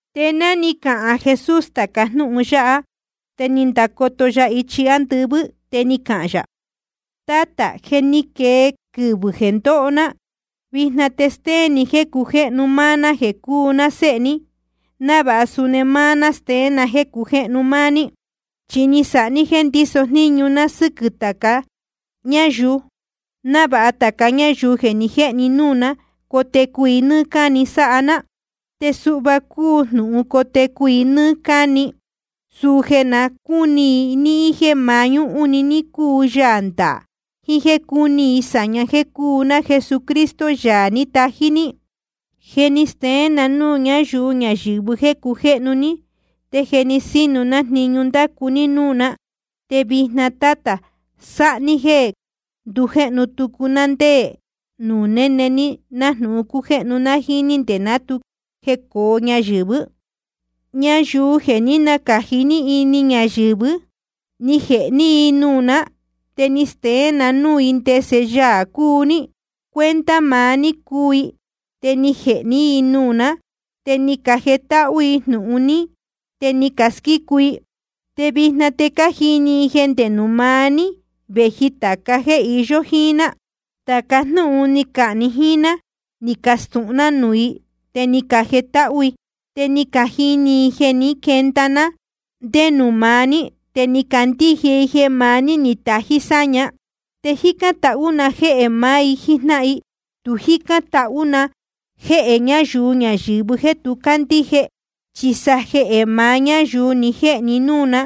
Te ná ni cahān Jesús tāca jnúhun yáha, te ni ndacoto ya ichi ándɨvɨ́, te ni cahān yā: Tátā, je ni quee quɨvɨ̄ jeē ndóho ná. Vijna te stéén ni jéē cujéhnu máá ná jeē cúu ná Séhe ní, návāha suni máá ná steén na jéē cujéhnu máá ní. Chi ni sáha ní jéē ndíso jníñu ná sɨ́quɨ̄ tāca ñáyuu, návāha tāca ñáyuu jeē ni jéhe ní núū ná, cotecu i nɨ́ɨ́ cáni sáha ná. Te suhva cúu jnūhun cotecu i nɨ́ɨ́ cáni: suu jeē na cúni i níhín jéē mañúhún‑ni ní cúu Yaā ndaā, jiín jéē cúni i sāñá jeē cúu ná Jesucristo, Yaā ní tají ní. ’Je ni steén na núū ñáyuu ñayɨ̄vɨ jéē cujéhnu ní, te je sínu ná jniñu ní ndacu ní núū ná. Te vijna, Tátā, sáha ní jéē ndujéhnu tucu ná ndé nuū néne ní, nájnūhun cújéhnu ná jíín ní nde ná tu jecōo ñayɨ̄vɨ́. ’Ñayuu jeē ní nacāji ní ini ñayɨ̄vɨ́, ni jēhe ní i nuū ná, te ni steén na núū i ndese Yaā cúu ní. Cuenta maá ní cúu i, te ni jēhe ní i nuū ná. Te ni cajetáhú i jnūhun ní, te ni casquícu i. Te vijna te cájini i jeē ndé nuū maá ní vēji tāca jéē iyó jíín ná. Chi tāca jnúhun ni cahān ni jíín ná, ní castūhun ná núū i, te ni cajetáhú i. Te ni cajini i jeē ní quenda ndije ná ndé nuū maá ní, te ni cacandíje i jeē maá ní ni tají sáña. ’Te jícán tahú na jéhē maá i jíjnáhan i. Tu jícán tahú na jéhē ñáyuu ñayɨ̄vɨ jéē tu cácandíje, chi sa jehē maá ñáyuu ni jéhe ni núū ná,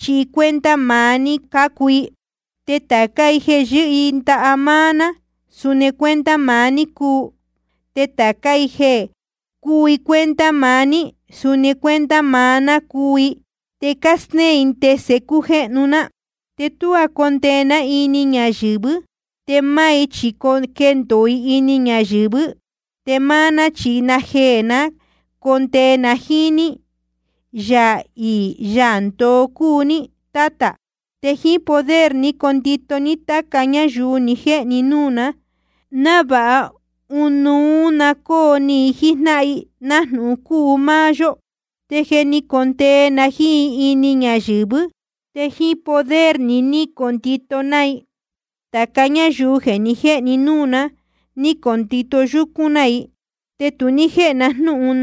chi cuenta maá ní cácuu i. Te tācá i jeē yɨ́hɨ i ndaha máá ná, suni cuenta maá ní cúu. Te tācá i jeē cúu i cuenta maá ní, suni cuenta maá ná cúu i. Te cástéén i ndese cújéhnu ná. ’Te tuá condee ná ini ñayɨ̄vɨ́. Te máá i chi quendōo i ini ñayɨ̄vɨ́, te máá ná chi najeē ná condee na jíín ní. Yaā iī Yaā ndoo cúu ní, Tátā. Te jíín poder ní condito ní táca ñáyuu ni jéhe ni núū ná, návāha ɨnuú na cóo ni i jíjnáhan i, nájnūhun cúu máá yó. Te jeē ní condee na jíín i ini ñayɨ̄vɨ́, te jíín poder ni ní condito ná i. Tāca ñáyuu ni jéhe ni núū ná, ni condito yúcún ná i. Te tu ní jéhe na jnúhun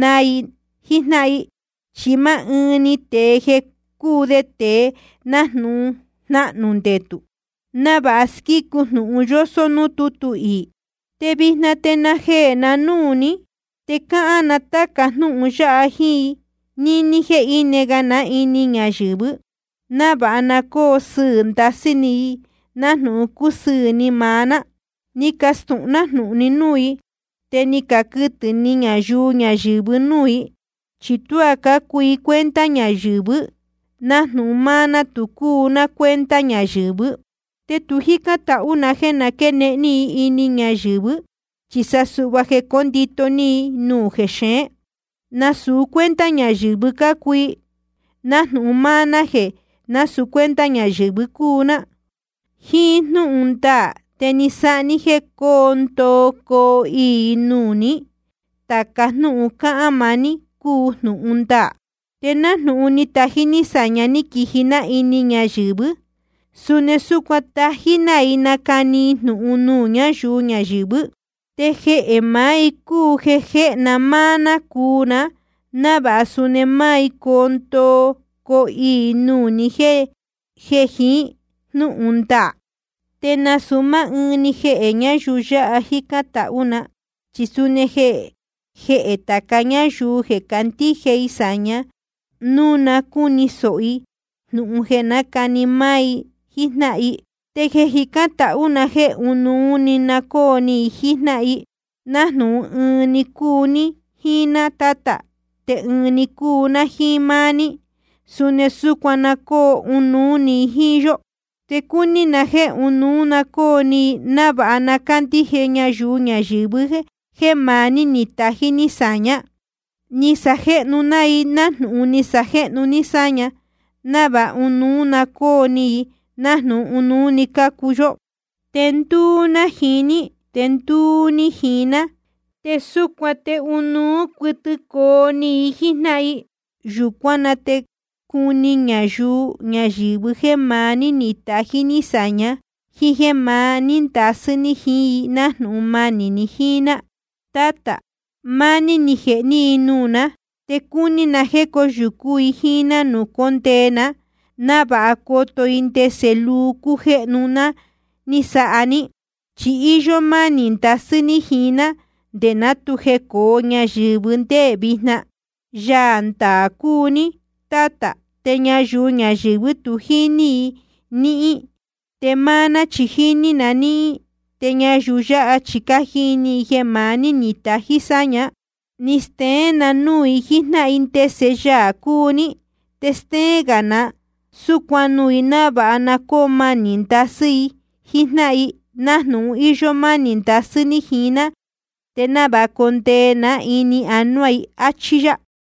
naa i jíjnáhan i, chi máá ɨɨn‑ni tēe jeē je cúu de tēe jnahnū ndetū, návāha squícu jnūhun yósó núū tútu iī. ’Te vijna te najeē na núū ní, te cáhán na táca jnúhun yáha jíín i níní jéē íne ga ná ini ñayɨ̄vɨ́, návāha na cóo sɨɨ̄ ndasɨ́ ni i nájnūhun cúsɨɨ̄ ni maá ná. Ni castūhun ná jnūhun ní núū i. Te ni caquɨtɨ̄ ni ñayuu ñayɨ̄vɨ núū i, chi tuá cácuu i cuenta ñayɨ̄vɨ́, nájnūhun máá ná tu cúu ná cuenta ñayɨ̄vɨ́. Te tu jícán tahú na jéē quénehen ní i ini ñayɨ̄vɨ́, chi sa suhva jeē cóndito ní i nuū jexeén. Nasūu cuenta ñayɨ̄vɨ cácuu i, nájnūhun máá ná jéē násūu cuenta ñayɨ̄vɨ cúu ná. Jíín jnúhun ndaā ní te sáha ní jéē coo ndoo coo iī i nuū ní. Tāca jnúhun cáhán maá ní cúu jnūhun ndaā. Te nájnūhun ni tají ní sāña ní quiji ná ini ñayɨ̄vɨ́, suni súcuan tají ná i nacani i jnūhun ní núū ñáyuu ñayɨ̄vɨ́. Te jehē maá i cúu jeē jéhe ná máá ná cuu ná, návāha suni máá i coo ndoo coo iī i nuū ni jéē jiín jnúhun ndaā. ’Te nasūu máá ɨɨn‑ni jehē ñáyuu yáha jícán tahú na, chi suni jehē tāca gá ñáyuu jeē candíje i sāña núu na cúni sōho i jnūhun jeē nácani máá i jíjnáhan i. Te jícán tahú na jéē ɨnuú na cóo ni i jíjnáhan i. Nájnūhun ɨɨn‑ni cúu ní jíín ná, Tátā, te ɨɨn‑ni cúu ná jíín máá ní, suni súcuan na cóo ɨnuú i jíín yó. Te cúní na jéē ɨnuú na cóo ni i, návāha na cándíje ñayuu ñayɨ̄vɨ jéē maá ní ni tají ní sāñá. Ni sajéhnu ná i nájnūhun ni sajéhnu ní sáña, návāha ɨnuú na cóo ni i, nájnūhun ɨnuú‑ni cúu yó. Te ndúú ná jiín i, te ndúú ní jiín ná, te súcuan te ɨnuú cuɨtɨ coo ni i jíjnáhan i. Yūcuán na te cuni ñayuu ñayɨ̄vɨ jéē maá ní ní tají ní sāña, jíín jéē maní ndasɨ́ ní jiín i nájnūhun manī ni jíín ná. ’Tátā, máá ní ni jēhe ní i nuū ná. Te cúní na jéē cóyūcú i jíín ná nuū cóndee ná, návāha coto i ndese luu cújéhnu ná ni sáha ní. Chi íyó mánī ndasɨ́ ní jiín ná nde ná tu jecōo ñayɨ̄vɨ́ te nde vijna. Yaā ndaā cúu ní, Tátā, te ñayuu ñayɨ̄vɨ́ tu jíní i níhín, te máá ná chi jíní na níhín. Te ñayuu yáha chi cájini i jeē maá ní ni tají sáña. Ni steén na núū i jíjnáhan i ndese Yaā cúu ní. Te stéén gā na súcuan nuū i, návāha na cóo manī ndasɨ́ i jíín jnáhan i, nájnūhun íyó mánī ndasɨ́ ní jiín ná, te návāha condee ná ini anuá i. Achí yá.